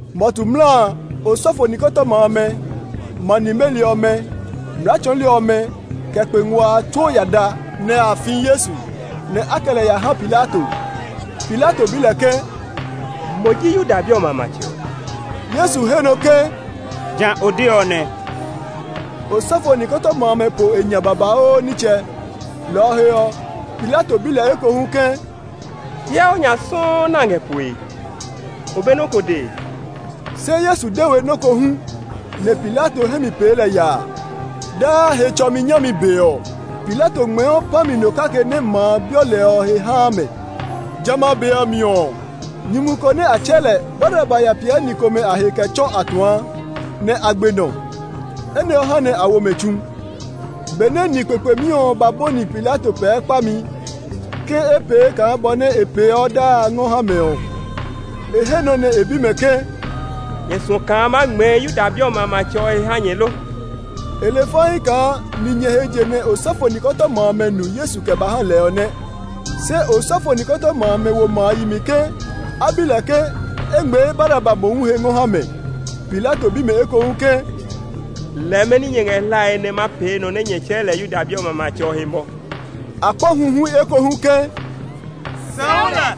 Mɔtu mla a, osɔfo nikɔtɔma amɛ, ma nimeli ɔmɛ, mlaa tsɔɔli ɔmɛ, kɛ kpe ngua a tsuo ya da, nɛ a fi Yesu; nɛ a kɛ lɛ ya ha Pilato. Pilato bi lɛ ke, “Mo ji Yuda bi ɔmɛ a matsɛ ɔ?” Yesu he nɔ ke, “Ja o de ɔ nɛ!” Osɔfo nikɔtɔma amɛ po e nya babauu nitsɛ, lɔ ɔ he ɔ, Pilato bi lɛ ekohu ke, “Hyɛ o nya sɔuu nɛ a ngɛ poe! O be nɔ́ ko dee?” Se Yesu de we nɔ́ ko hu; nɛ Pilato hɛ mi pee lɛ yaa. Daa Hetsɔmi nyami be ɔ, Pilato ngmɛɛɔ pã mi no kake nɛ ma a bi lɛ ɔ he haa mɛ. Jamɛ a be ɔ mi ɔ, nyumu ko nɛ a tsɛɛ lɛ Baraba ya piɛ ni komɛ a he kɛ tsɔ atuã, nɛ a gbe nɔ. Enɛ ɔ ha nɛ a wo mɛ tsu. Benɛ ni kpekpemi ɔ ba bɔni Pilato pɛɛ kpami ke e pee kaa bɔ nɛ e peeɔ daa a ngɔ ha mɛ ɔ, e he nɔ nɛ e bi mɛ ke, “Nyɛ suɔ kaa ma ngmɛɛ Yuda bi ɔmɛ a matsɛ ɔ he ha nyɛ lo?” E le faii kaa ninyɛ he je nɛ osɔfo nikɔtɔma amɛ nu Yesu kɛ ba ha lɛ ɔ nɛ. Se osɔfo nikɔtɔma amɛ wo ma a yi mi ke a bi lɛ ke e ngmɛɛ Baraba mohu he ngɔ ha mɛ. Pilato bi mɛ ekohu ke, “Lɛɛ mɛni nyɛ ngɛ hlae nɛ ma pee nɔ nɛ nyɛ tsɛɛ lɛ Yuda bi a matsɛ ɔ he mɔ?” A kpa huhui ekohu ke, “Sɛu lɛ!”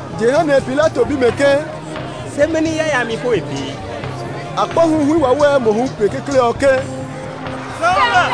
Jehanɛ Pilato bi mɛ ke, “Se mɛni yayami po e pee?” A kpa huhui wawɛɛ mohu pe kekle ɔ ke, “Sɛu lɛ!”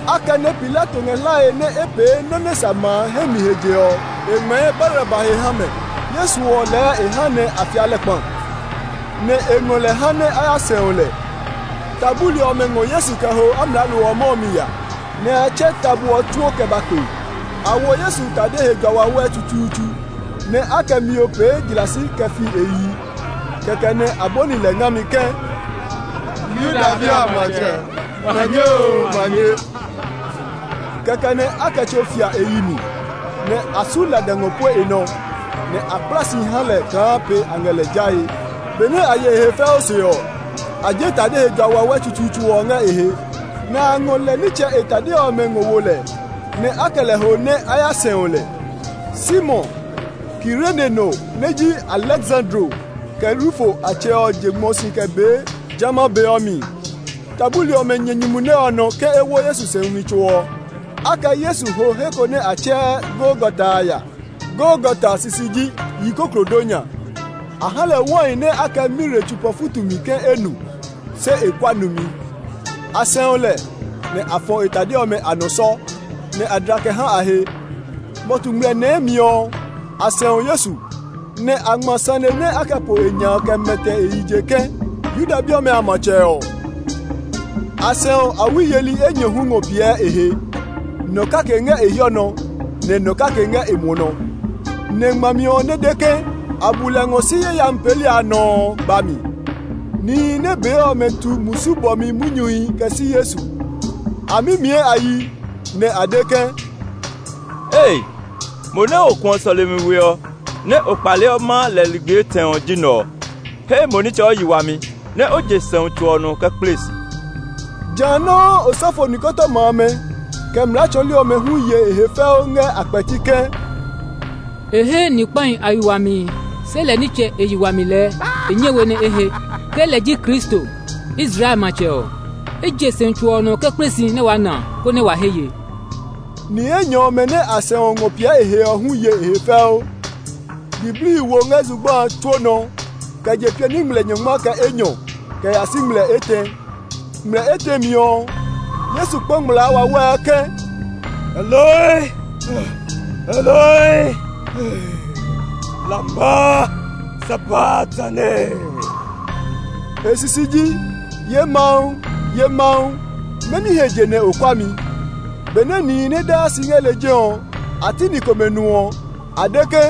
Akɛnɛ Pilato ngɛ hlae nɛ e pee nɔ́ nɛ sa ma a hɛ mi he je ɔ, e ngmɛɛ Baraba he ha mɛ. Yesu ɔ lɛɛ e ha nɛ a fia lɛ kpa, nɛ e ngɔ lɛ ha a ya sɛu lɛ. Ta buli ɔmɛ ngɔ Yesu kɛ ho amlaalo ɔ mɔ ɔ mi ya; nɛ a tsɛ tabo ɔ tsuo kɛ ba kpe. A wo Yesu tade he jua wawɛ tsutsuutsu, nɛ a kɛ mio pee jlasi kɛ fi e yi. Kɛkɛ nɛ a bɔni lɛ ngami ke, “Yuda bi a matsɛ, manye oo, manye!” Kɛkɛ nɛ a kɛ tso fia e yi mi, nɛ a su lada ngɔ pue e nɔ, nɛ a kpla si ha lɛ kaa pe a ngɛ lɛ jae. Benɛ a ye e he fɛu se ɔ, a je tade he jua wawɛ tsutsuutsu ɔ ngɛ e he, nɛ a ngɔ lɛ nitsɛ e tade ɔmɛ ngɔ wo lɛ; nɛ a kɛ lɛ ho nɛ a ya sɛu lɛ. Simon, Kirene no nɛ ji Aleksandro kɛ Rufo a tsɛ ɔ je ngmɔ si kɛ bee jamɛ a be ɔ mi. Ta buli ɔmɛ nyɛ nyumu nɛ ɔ nɔ ke e wo Yesu sɛumi tso ɔ. A kɛ Yesu ho he ko nɛ a tsɛɛ Golgata a ya (Golgata sisi ji Yikoklodonya). A ha lɛ wai nɛ a kɛ mire tsopa futu mi ke e nu; se e kua numi. A sɛu lɛ, nɛ a fɔ e tade ɔmɛ a nɔ sɔ, nɛ a dla kɛ ha a he. Mɔtu ngmlɛ nɛɛ mi ɔ, a sɛu Yesu, nɛ a ngma sane nɛ a kɛ po e nya a kɛ mɛtɛ e yi je ke, “Yuda bi ɔmɛ a matsɛ ɔ.” A sɛu awi yeli enyɔ hu ngɔ piɛ e he; nɔ kake ngɛ e hiɔ nɔ, nɛ nɔ kake ngɛ e muɔ nɔ. [ Nɛ ngmami ɔ nɛ de ke, “A bu lɛ ngɔ si yayami peeli nɔ” ɔ ba mi.] Nihi nɛ bee ɔ tu musu bɔmi munyuhi kɛ si Yesu. A mimiɛ a yi, nɛ a de ke, “Ei, mo nɛ o kuɔ sɔlemi we ɔ, nɛ o kpaleɔ maa lɛ ligbi etɛ ɔ ji nɛ ɔ! He mo nitsɛ o yi wami, nɛ o je sɛumi tso ɔ nɔ kɛ kple si!” Jã nɔuu osɔfo nikɔtɔma amɛ, kɛ mlaa tsɔɔli ɔmɛ hu ye e he fɛu ngɛ a kpɛti ke, “E he ni kpahi a yi wami, se lɛ nitsɛ e yi wami lɛɛ e nyɛ we nɛ e he. Ke lɛ ji Kristo, Israel matsɛ ɔ, e je sɛumi tso ɔ nɔ kɛ kple si nɛ waa na konɛ wa he ye!” Ni enyɔ ɔmɛ nɛ a sɛu ngɔ piɛ e he ɔ hu ye e he fɛu. Diblii wo ngɛ zugba a tsuo nɔ kɛ je piani ngmlɛ nyɔngma kɛ enyɔ kɛ ya si ngmlɛ etɛ. Ngmlɛ etɛ mi ɔ, Yesu kpa ngmlaa wawɛɛ ke, “Eloi, Eloi, lama sabaktani?” E sisi ji, “Ye Mawu, ye Mawu, mɛni he je nɛ o kua mi?” Benɛ nihi nɛ daa si ngɛ lejɛ ɔ, a ti ni komɛ nu ɔ, a de ke,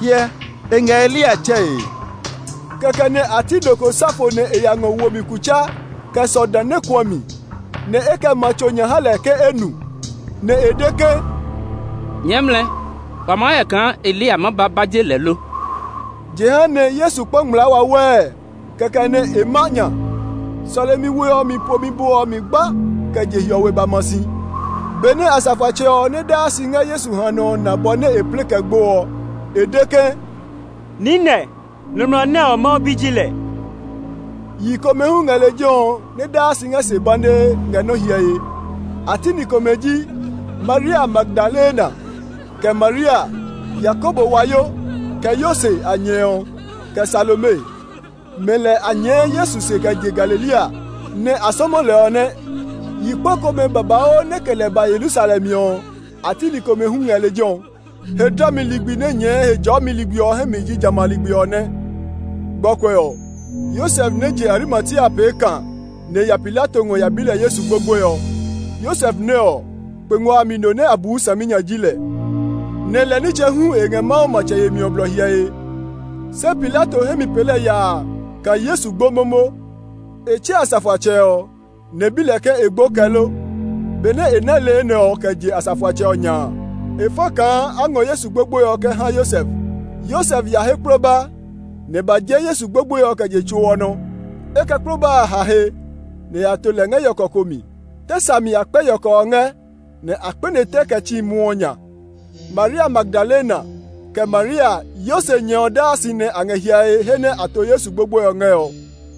“Hyɛ, e ngɛ Eliya tsɛe.” Kɛkɛ nɛ a ti nɔ ko sa fo nɛ e ya ngɔ wo mi kutsa kɛ sɔ dã nɛ kuã mi, nɛ e kɛ ma tso nya ha lɛ ke e nu; nɛ e de ke, “Nyɛɛ mlɛ! Wa maa hyɛ kaa Eliya maa ba ba je lɛ lo!” Jehanɛ Yesu kpa ngmlaa wawɛɛ, kɛkɛ nɛ e ma nya. Sɔlemi we ɔ mi pomi bo ɔ mi gba kɛ je hiɔwe ba ma si. Benɛ asafoatsɛ ɔ nɛ daa si ngɛ Yesu hanɔ ɔ na bɔ nɛ e plɛ kɛ gbo ɔ, e de ke, “Niinɛ, nɔmlɔ nɛ ɔ, Mawu Bi ji lɛ!” Yi komɛ hu ngɛ lejɛ ɔ nɛ daa si ngɛ se banee ngɛ nɔ hyɛe. A ti ni komɛ ji Maria Magdalena kɛ Maria, Yakobo wayo kɛ Yose a nyɛ ɔ, kɛ Salome. Mɛ lɛ a nyɛɛ Yesu se kɛ je Galilea, nɛ a sɔmɔ lɛ ɔ nɛ. Yi kpa komɛ babauu nɛ kɛ lɛ ba Yerusalem ɔ, a ti ni komɛ hu ngɛ lejɛ ɔ. He dlami ligbi nɛ nyɛɛ Hejɔɔmi ligbi ɔ hɛ mi ji jamɛ a ligbi ɔ nɛ. Gbɔkuɛ ɔ, Yosef nɛ je Arimatia pee kã nɛ e ya Pilato ngɔ ya bi lɛ Yesu gbogboe ɔ. Yosef nɛ ɔ, kpe ngua a mi no nɛ a buu saminya ji lɛ, nɛ lɛ nitsɛ hu e ngɛ Mawu matsɛ yemi ɔ blɔ hyɛe. Se Pilato hɛ mi pee lɛ yaa kaa Yesu gbo momo. E tsɛ asafoatsɛ ɔ, nɛ e bi lɛ ke e gbo kɛ lo. Benɛ e ná le enɛ ɔ kɛ je asafoatsɛ ɔ nya a, e fa kaa a ngɔ Yesu gbogboe ɔ kɛ ha Yosef. Yosef ya he kploba; nɛ e ba je Yesu gbogboe ɔ kɛ je tso ɔ nɔ. E kɛ kploba a ha he, nɛ e ya to lɛ ngɛ yɔkɔ ko mi. Tɛ sa mi a kpɛ yɔkɔ ɔ ngɛ, nɛ a kpɛne tɛ kɛ tsi muɔ ɔ nya. Maria Magdalena, kɛ Maria, Yose nyɛ ɔ daa si nɛ a ngɛ hyɛe he nɛ a to Yesu gbogboe ɔ ngɛ ɔ.